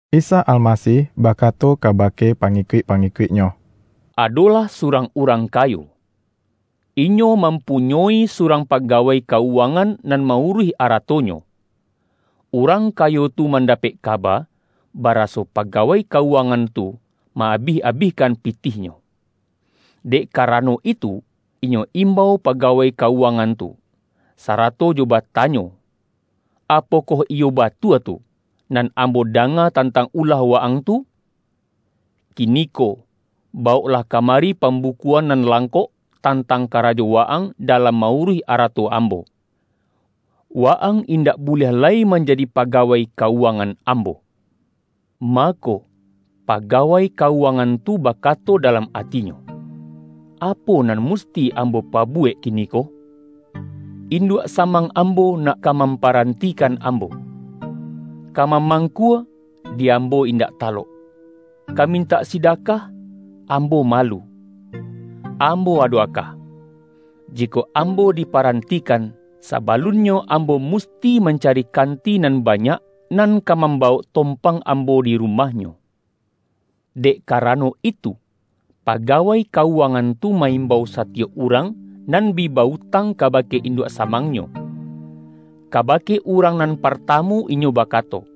Isa Almasih bakato kabake pa-ngikuik-pangikuik-Nyo,”Ado-lah surang urang kayo. Inyo mampu-nyoi surang pagawai ka-uwangan nan ma-uruih aratonyo. Urang kayo tu mandapek kaba, baraso pagawai ka-uwangan tu, ma-abih-abihkan pi-tihnyo. Dek karano itu, inyo imbau pagawai ka-uwangan tu, sarato jo ba-tanyo, ’Apokoh iyo batua tu, nan ambo danga tantang ulah wa-ang tu? Ki-niko, bawoklah kamari pambukuan nan langkok, tantang karajo wa-ang dalam ma-uruih arato ambo. Wa-ang indak buliah lai manjadi pagawai ka-uwangan ambo.’ Mako, pagawai ka-uwangan tu bakato dalam atinyo, ’Apo nan musti ambo pabuwek kiniko? In-duak samang ambo nak ka mamparan-tikan ambo. Ka mamangkua, di ambo indak talok; ka mintak sidakah ambo malu. Ambo ado aka; jikok ambo dipa-rantikan, sabalunnyo ambo musti man-cari kanti nan banyak, nan ka mam-bawok tompang ambo di rumahnyo!' Dek karano itu, pagawai ka-uwangan tu ma-imbau satiyok urang, nan bi ba-utang kabake induak samangnyo. Ka-bake urang nan partamu inyo bakato,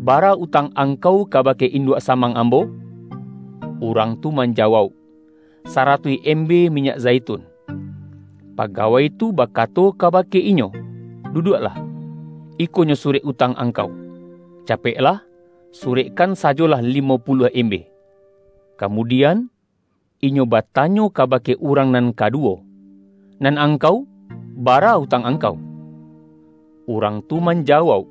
’Bara utang angkau kabake induak sa-mang ambo?' Urang tu manjawauk, ’Saratuih embe minyak zaitun.’ Paga-wai tu bakato kabake inyo, ’Duduak-lah, ikonyo surek utang angkau, ca-peklah, surekkan sajolah limo puluah embe.’ Kamudian, inyo batanyo ka-bake urang nan kaduwo, ’Nan angkau, bara utang angkau?' Urang tu manja-wauk,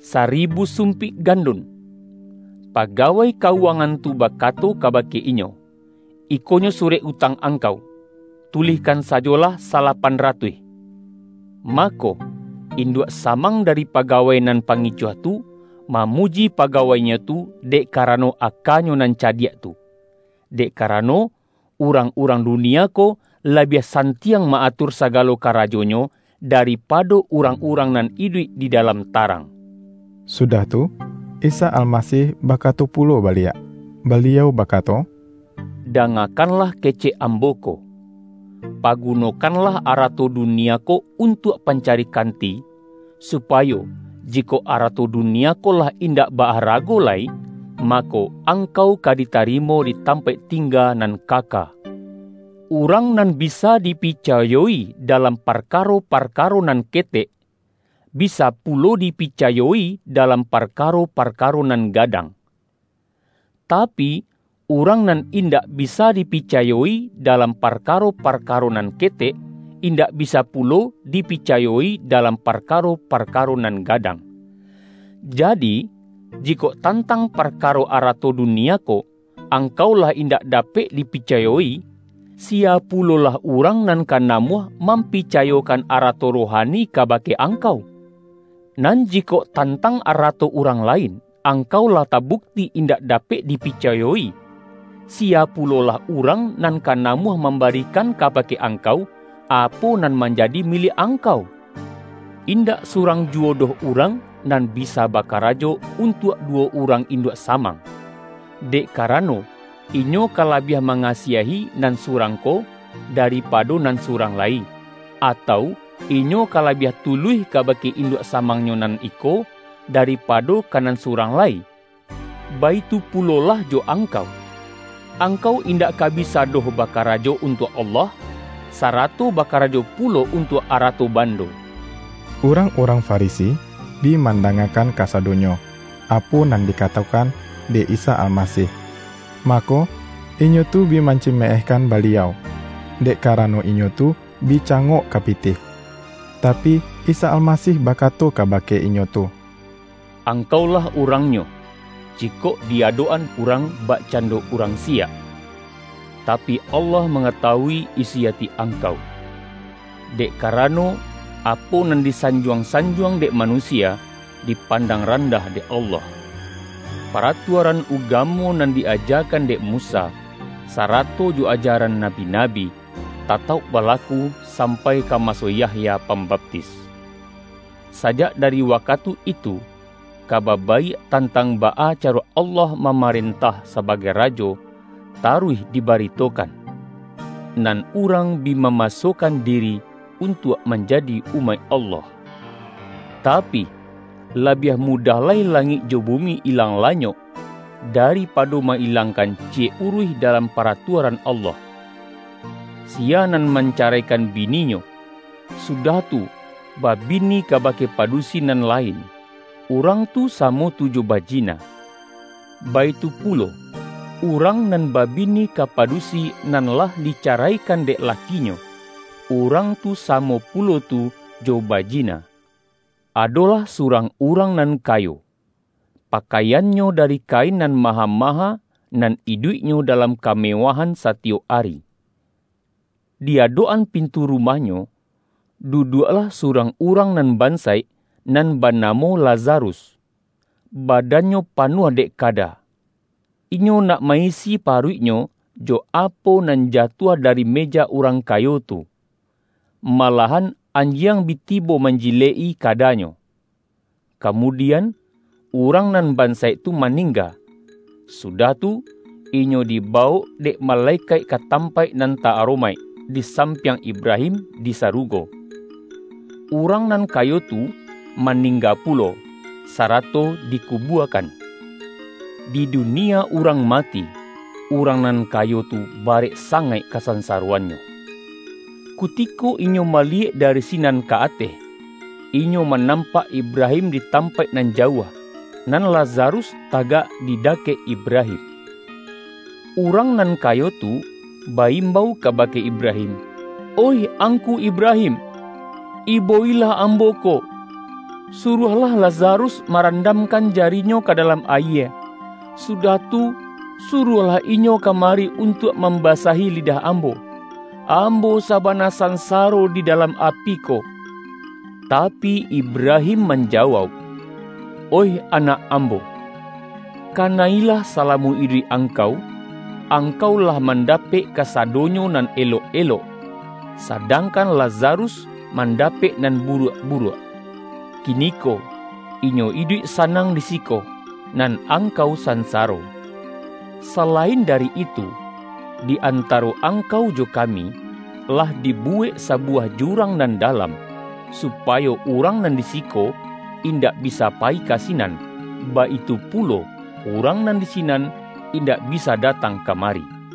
’Saribu sumpik gandun.’ Paga-wai ka-uwangan tu bakato kabake inyo, ’Ikonyo surek utang angkau. Tulihkan sajolah: salapan ratuih.’ Mako, induak samang dari paga-wai nan pangicuah tu, mamuji paga-wainyo tu, dek karano akanyo nan cadiak tu; dek karano, urang-urang dunia ko, labiah santiang ma-atur sa-galo karajonyo, daripado urang-urang nan iduik di dalam tarang.” Sudah tu, Isa Almasih bakato pulo baliak, Baliau bakato,”Dangakanlah kecek Ambo ko! Pagunokanlah arato dunia ko untuak pancari kanti, supa-yo, jikok arato dunia ko lah indak ba-arago lai, mako, angkau ka ditarimo di tampaik tingga nan kaka. Urang nan bisa dipicayo-i dalam parkaro-par-karo nan ketek, bisa pulo dipicayo-i dalam parkaro-parkaro nan gadang. Tapi, urang nan indak bisa dipicayo-i dalam parkaro-parkaro nan ketek, in-dak bisa pulo dipicayo-i dalam parka-ro-parkaro nan gadang. Jadi, jikok tantang parkaro arato dunia ko, ang-kau lah indak dapek dipicayo-i, siya pulolah urang nan ka namuah, mam-picayokan arato rohani kabake ang-kau? Nan jikok tantang arato urang lain, angkau lah tabukti indak dapek dipicayo-i, siya pulolah urang nan ka namuah mambarikan kabake angkau, apo nan manjadi miliak angkau? Indak surang juwo doh urang nan bisa bakarajo, untuak duwo urang in-duak samang; dek karano, inyo ka la-biah mangasiahi nan surang ko, daripa-do nan surang lai, atau, inyo ka labiah tuluih kabake induak samangnyo nan iko, daripado ka nan surang lai. Baitu pulolah jo angkau. Angkau indak ka bi-sa doh bakarajo untuak Allah, sarato bakarajo pulo untuak arato bando.” Urang-urang Farisi bi mandanga-kan kasadonyo, apo nan dikatokan dek Isa Almasih. Mako, inyo tu bi manci-meehkan Baliau, dek karano inyo tu bi cangok ka pitih. Tapi, Isa Alma-sih bakato kabake inyo tu,”Angkaulah urangnyo, jikok di adok-an urang, bak-cando urang siyak, tapi, Allah manga-tawui isi ati angkau. Dek karano, apo nan disanjuang-sanjuang dek manusia, dipandang randah dek Allah. Paratuaran ugamo nan di-ajakan dek Musa, sarato jo ajaran nabi-nabi, tatauk balaku, sampai ka maso Yahya Pambaptis. Sajak dari wakatu itu, Ka-ba Baiak tantang baa caro Allah ma-marentah sabagai Rajo, taruih dibari-tokan. Nan urang bi mamasokan diri untuak manjadi umaik Allah. Tapi, labiah mudah lai langik jo bumi ilang lanyok, daripado ma-ilangkan ciyek uruih dalam Paratuaran Allah. Siya nan mancaraikan bininyo, su-dah tu, babini kabake padusi nan la-in, urang tu samo tu jo bajina. Baitu pulo, urang nan babini ka padusi, nan lah dicaraikan dek lakinyo, urang tu samo pulo tu jo bajina.” ”Adolah surang urang nan kayo. Pakaiannyo dari kain nan maha-ma-ha, nan iduiknyo dalam kamewahan satiyok ari. Di adok-an pintu rumah-nyo, duduaklah surang urang nan ban-saik, nan banamo Lazarus. Badannyo panuah dek kada. Inyo nak ma-isi paruiknyo, jo apo nan jatuah dari me-ja urang kayo tu. Malahan anjiang bi tibo manjilek-i kadanyo. Kamudian, urang nan bansaik tu maningga, sudah tu, inyo dibawok dek malekaik ka tampaik nan ta-aromaik, di sampiang Ibrahim di sarugo. Urang nan kayo tu, maningga pulo, sarato dikubuakan. Di dunia urang ma-ti, urang nan kayo tu barek sangaik kasansaroannyo. Kutiko inyo mali-yek dari sinan ka ateh, inyo manam-pak Ibrahim di tampaik nan jauah, nan Lazarus tagak di dakek Ibrahim. Urang nan kayo tu, ba-imbau ka-bake Ibrahim. ’Oih angku Ibrahim, ibo-ilah ambo ko. Suruahlah Lazarus marandamkan jarinyo ka dalam ayie, sudah tu, suruahlah inyo kamari un-tuak mambasahi lidah ambo. Ambo sabana sansaro di dalam api ko!' Tapi, Ibrahim manjawauk, ’Oih anak ambo: kana-ilah salamo iduik angkau, angkau lah mandapek kasa-donyo nan elok-elok, sadangkan La-zarus, mandapek nan buruak-buruak. Kiniko inyo iduik sanang di siko, nan angkau sansaro. Salain dari itu, di antaro angkau jo kami, lah dibuwek sabuwah jurang nan dalam, supayo urang nan di siko, indak bisa payi ka sinan, baitu pulo urang nan di sinan, indak bisa datang kamari!'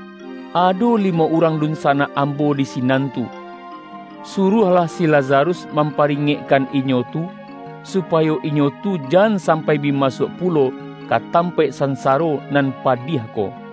Ado li-mo urang dunsanak ambo di sinan tu. Suruahlah si Lazarus mamparingek-kan inyo tu, supayo inyo tu jan sam-pai bi masuak pulo, ka tampaik san-saro nan padiah ko.’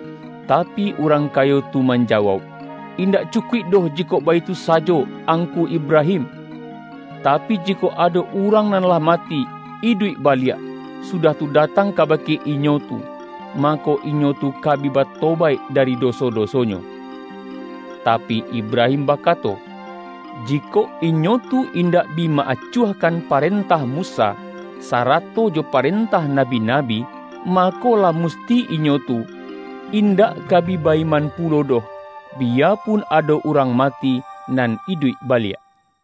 Tapi, urang kayo tu manjawauk, ’Indak cu-kuik doh jikok baitu sajo, angku Ibra-him. Tapi, jikok ado urang nan lah mati, iduik baliak, sudah tu, datang kabake inyo tu, mako, inyo tu ka bi batobaik dari doso-dosonyo.’ Tapi, Ibrahim ba-kato, ’Jikok inyo tu indak bi ma-acuah-kan parentah Musa, sarato jo parentah nabi-nabi, mako, lah musti inyo tu in-dak ka bi ba-iman pulo doh, biyapun ado urang mati nan iduik baliak.’”